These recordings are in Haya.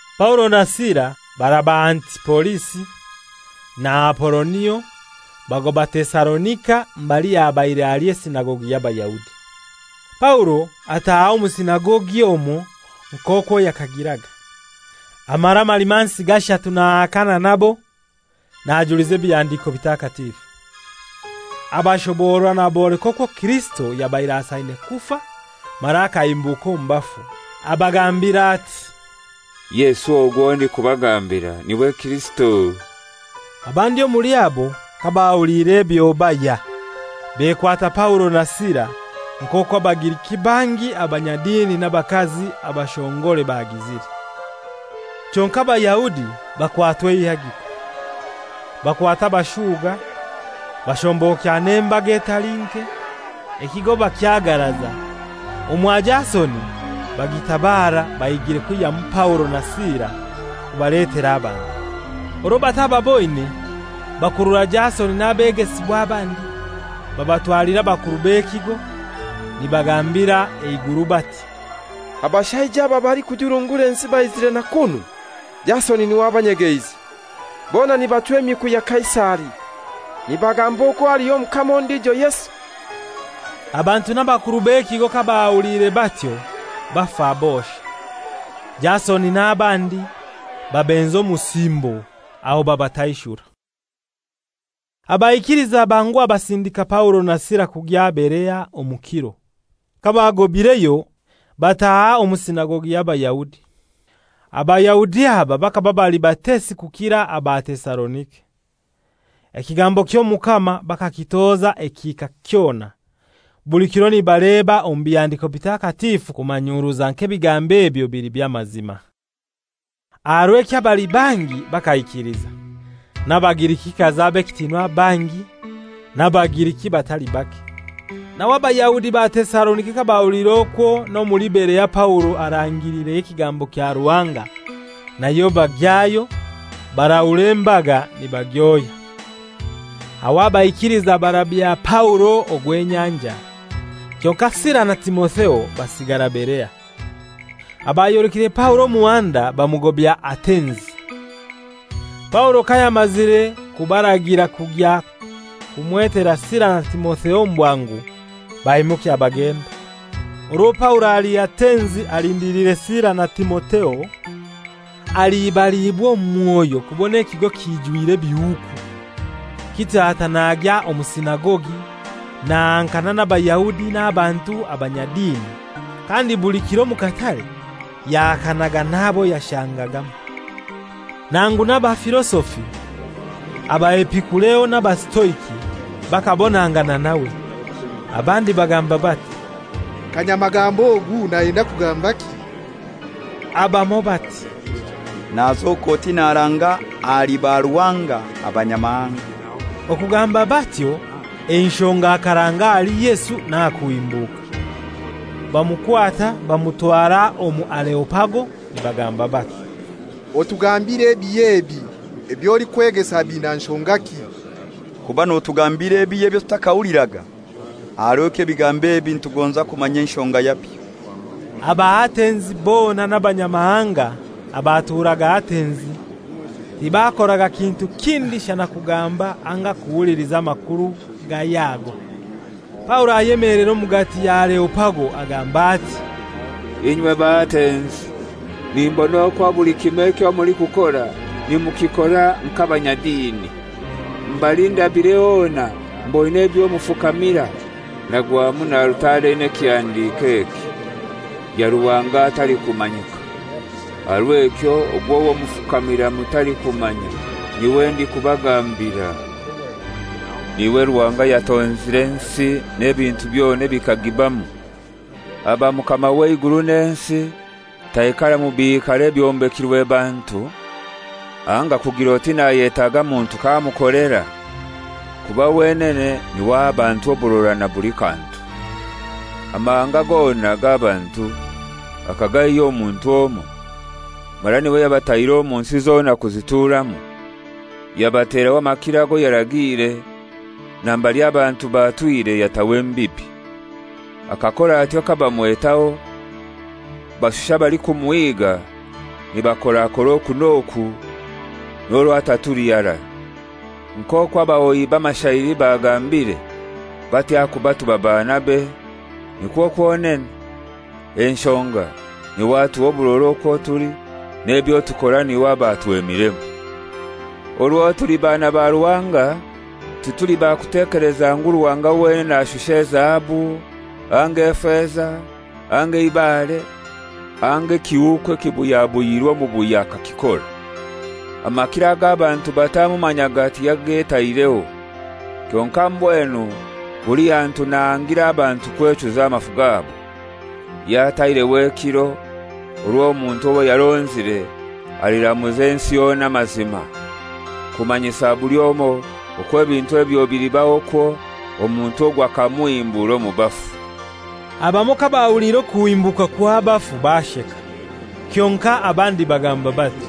Paulo na Sila baraba Antipolisi na Apolonio bagoba Tesalonika mbali habaire ali esinagogi y'Abayahudi. Paulo ataaha omu sinagogi omwo nk'okwo yakagiraga, amara amalimansi gashatu nahakana nabo najuliza Ebihandiko Bitakatifu. Abashoborora naboleka okwo Kirisito yabaire asaine kufa mara akahimbuka omu bafu. Abagambira ati, «Yesu ogu owo ndikubagambira n'iwe Kirisito.» Abandi omuli abo kabahuliire ebyo bahya, bekwata Paulo na Sila, nk'okwo Abagiriki bangi abanyadini n'abakazi abashongore bagizire. Kyonkai Abayahudi bakwatwa eihagiko, bakwata abashuga, bashombokya n'embaga etali nke, ekigo bakyagaraza, omwa Jasoni bagiitabara bahigire kwihyamu Paulo na Sila kubaletera abantu. Orwo batababoine, bakurura Jasoni n'abegesibwa abandi babatwalira abakuru b'ekigo, nibagambira eiguru bati, «Abashaija aba abalikujurungura ensi baizire na kunu; Jasoni n'iwe abanyegeize. Bona nibachwa emiku ya Kaisari, nibagamba okwo haliyo omukama ondijo Yesu.» Abantu n'abakuru b'ekigo kabahuliire batyo bafa bosha. Jasoni n'abandi babenza omusimbo, aho babataishura. Abaikiliza banguha basindika Paulo na Sila kugya Berea omu kiro. Kabagobaireyo bataha omu sinagogi y'Abayahudi. Abayahudi aba bakaba bali batesi kukira aba Tesalonika. Ekigambo ky'Omukama bakakitoza ekihika kyona, buli kiro nibaleba omu Bihandiko Bitakatifu kumanyuruza nk'ebigambo ebyo bili by'amazima. Aha rw'ekyo abali bangi bakaikiliza, n'Abagirikikazi ab'ekitinwa bangi n'Abagiriki batali bake. Nawe Abayahudi ba Tesalonika kabahuliire okwo n'omuli Berea Paulo arangireyo ekigambo kya Ruhanga, nayo bagyayo, barahura embaga nibagyohya. Aho abaikiliza barabya Paulo ogw'enyanja, kyonkai Sila na Timotheo basigara Berea. Abayolekire Paulo omuhanda bamugobya Atenzi. Paulo kayamazire kubaragira kugya kumwetera Sila na Timotheo omu bwangu, baimukya bagenda. Orwo Paulo ali Atenzi alindiliire Sila na Timotheo, alibaliibwa omu mwoyo kubona ekigo kijwire ebihuuku. Kityo ata nagya omu sinagogi nahankana n'Abayahudi n'abantu abanyadini, kandi buli kiro omu katare yahakanaga n'abo yashangagamu. Nangu n'abafilosofi: Abaepikureo n'Abasitoiki bakabonangana nawe. Abandi bagamba bati, «Kanyamagambo ogu nayenda kugambaki!» Abamoi bati, «Nazoka oti naranga ahali baruhanga abanyamahanga.» Okugamba batyo enshonga akaranga ahali Yesu n'aha kuhimbuka. Bamukwata bamutwara omu Areopago nibagamba bati, «Otugambire ebihya ebi eby'olikwegesa biina nshongaki? Kuba notugambira ebihya ebyo tutakahuliraga. Aha rw'ekyo ebigambo ebi nitugonza kumanya enshonga yabyo.» Abaatenzi bona n'abanyamahanga abaturaga Atenzi tibakoraga kintu kindi shana kugamba anga kuhuliliza amakuru gahya ago. Paulo ayemelera omugati ya Areopago agamba ati, «Inywe Baatenzi, nimbona okwo buli kimoi ekyo mulikukora nimukikora nk'abanyadini. Mbali ndabire hona mboine ebyo mufukamira, nagwamu na alutare eina ekihandiko eki: ‹Ya ruhanga atalikumanyika.› Aha rw'ekyo ogwo owo mufukamira mutalikumanya n'iwe ndikubagambira. N'iwe Ruhanga ayatonzire ensi n'ebintu byona ebikagibamu. Aba Mukama w'eiguru n'ensi, taikara mu biikaro ebyombekirwe bantu, anga kugir'oti nayetaaga muntu k'amukolera, kuba wenene n'iwe aha abantu oburora na buli kantu. Amahanga gona g'abantu akagaihya omu muntu omoi, mara n'iwe yabataire omu nsi zona kuzituramu, yabateraho amakiro ago yaragiire, na mbali abantu batwire yataho embibi. Akakora atyo kabamwetaho, bashushe abalikumuhiga nibakorakora oku n'oku, n'orwo atatuli harai, nk'okwo abahoyi b'amashairi bagambire bati, ‹Ahakuba tuba baanabe,› nikwo kwonene, enshonga, ‹N'iwe atuha oburora okwo tuli n'ebyo tukora n'iwe aba atwemiremu.› Orwo tuli baana ba Ruhanga, tituli bakutekeleza ngu Ruhanga wenene ashusha ezahabu, anga efeza, anga eibare, anga ekihuuku ekibuyabuyirwe omubuya akakikora. Amakiro ag'abantu batamumanyaga tiyagetaireho. Kyonkai mbwenu buli hantu nahangira abantu kwechuza amafu gabo. Yataireho ekiro orwo omuntu owo yaronzire aliramuza ensi yona amazima. Kumanyisa buli omoi okwo ebintu ebyo bilibaho kwo, omuntu ogwo akamuhimbura omu bafu.» Abamoi kabahuliire okuhimbuka kw'abafu, basheka. Kyonkai abandi bagamba bati,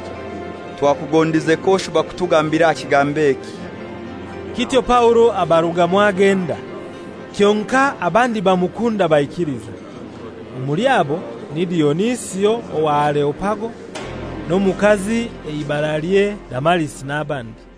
«Twakugondize k'oshuba kutugambira aha kigambo eki!» Kityo Paulo abarugamu agenda. Kyonkai abandi bamukunda baikiliza. Omuli abo ni Dionisio owa Areopago n'omukazi eibaralye Damarisi n'abandi.